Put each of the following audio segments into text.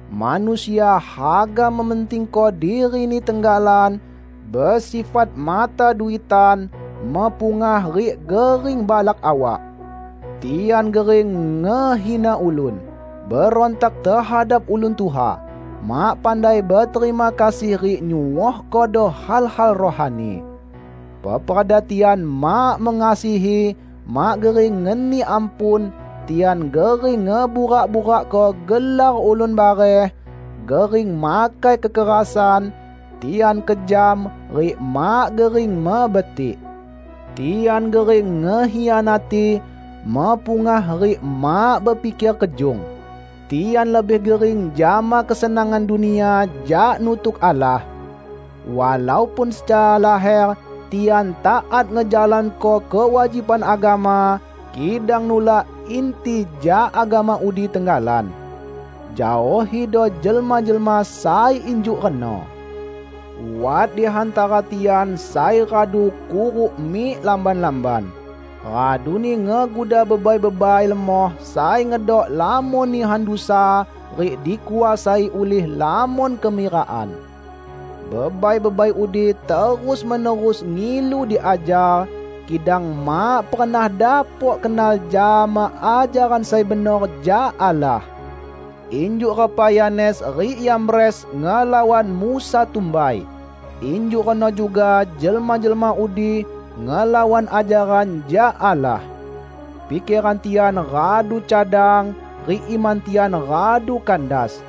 Manusia haga mementingko dirini tenggalan, besifat mata duitan, mepungah rik gering balak awak. Tian gering ngehina ulun, berontak tehadap ulun tuha, mak pandai beterima kasih rik nyuohkodo hal-hal rohani. Peperda tian mak mengasihi, mak gering ngeni ampun, tian gering ngeburak-burakko gelar ulun bareh, gering makai kekerasan, tian kejam, rik mak gering mebetik. Tian gering ngekhianati, mepungah rik mak bepiker kejung. Tian lebih gering jama kesenangan dunia jak nutuk Allah. Walaupun secara laher, tian taat ngejalanko kewajiban agama, kidang nulak inti jak agama udi tenggalan. Jaohido jelma-jelma sai injuk reno. Wat di hantara tian sai radu kuruk mik lamban-lamban, raduni ngeguda bebai-bebai lemoh sai ngedok lamon nihan dusa rik dikuasai ulih lamon kemirakan. Bebai-bebai udi terus-menerus ngilu diajar, kidang mak pernah dapok kenal jama ajaran sai benor jak Allah. Injuk repa Yanes rik Yambres ngelawan Musa tumbai, injuk reno juga jelma-jelma udi ngelawan ajaran jak Allah. Pikeran tian radu cadang, rik iman tian radu kandas.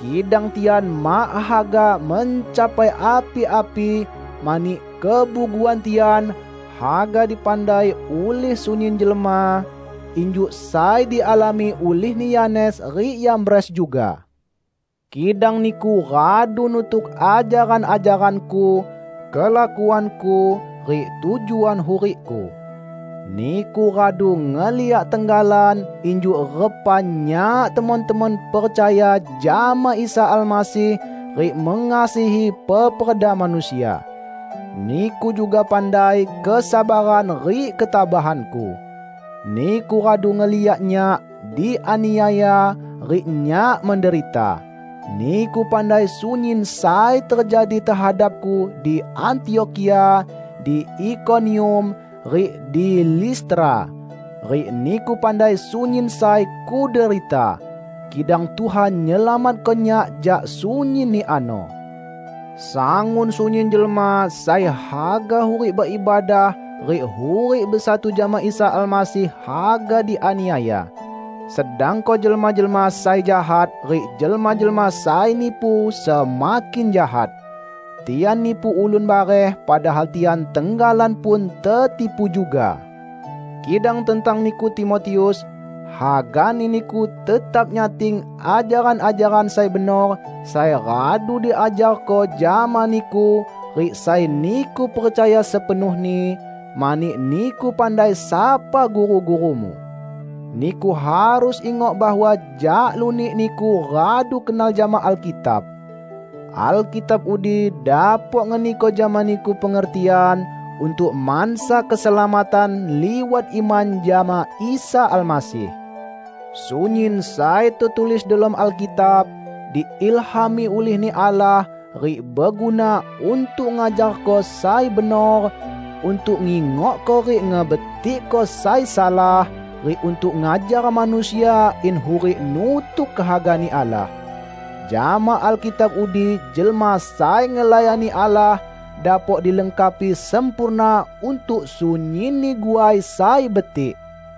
Kidang tian mak haga mencapai api-api mani kebuguan tian haga dipandai ulih sunyin jelma, injuk sai dialami ulihni Yanes rik Yambres juga. Kidang niku radu nutuk ajaran-ajaranku, kelakuanku, rik tujuan hurikku. Niku radu ngeliak tenggalan injuk repa nyak temon-temon percaya jama Isa Almasih rik mengasihi peperda manusia. Niku juga pandai kesabaran rik ketabahanku. Niku radu ngeliak nyak dianiaya rik nyak menderita. Niku pandai sunyin sai tejadi tehadapku di Antiokhia, di Ikonium, rik di Listra; rik niku pandai sunyin sai kuderita! Kidang Tuhan nyelamatko nyak jak sunyinni ano. Sangun sunyin jelma sai haga hurik beibadah rik hurik besatu jama Isa Almasih haga dianiaya, sedangko jelma-jelma sai jahat rik jelma-jelma sai nipu semakin jahat. Tian nipu ulun bareh padahal tian tenggalan pun tetipu juga. Kidang tentang niku, Timotius, hagani niku tetap nyating ajaran-ajaran sai benor sai radu diajarko jama niku rik sai niku percaya sepenuhni; mani niku pandai sapa guru-gurumu! Niku harus ingok bahwa jak lunik niku radu kenal jama Alkitab. Alkitab udi dapok ngeniko jama niku pengertian untuk mansa keselamatan liwat iman jama Isa Almasih. Sunyin sai tetulis delom Alkitab, diilhami ulih-Ni Allah rik beguna untuk ngajarko sai benor, untuk ngingokko rik ngebetikko sai salah, rik untuk ngajar manusia in hurik nutuk kehaga-Ni Allah. Jama Alkitab udi jelma sai ngelayani Allah dapok dilengkapi sempurna untuk sunyinni guai sai betik.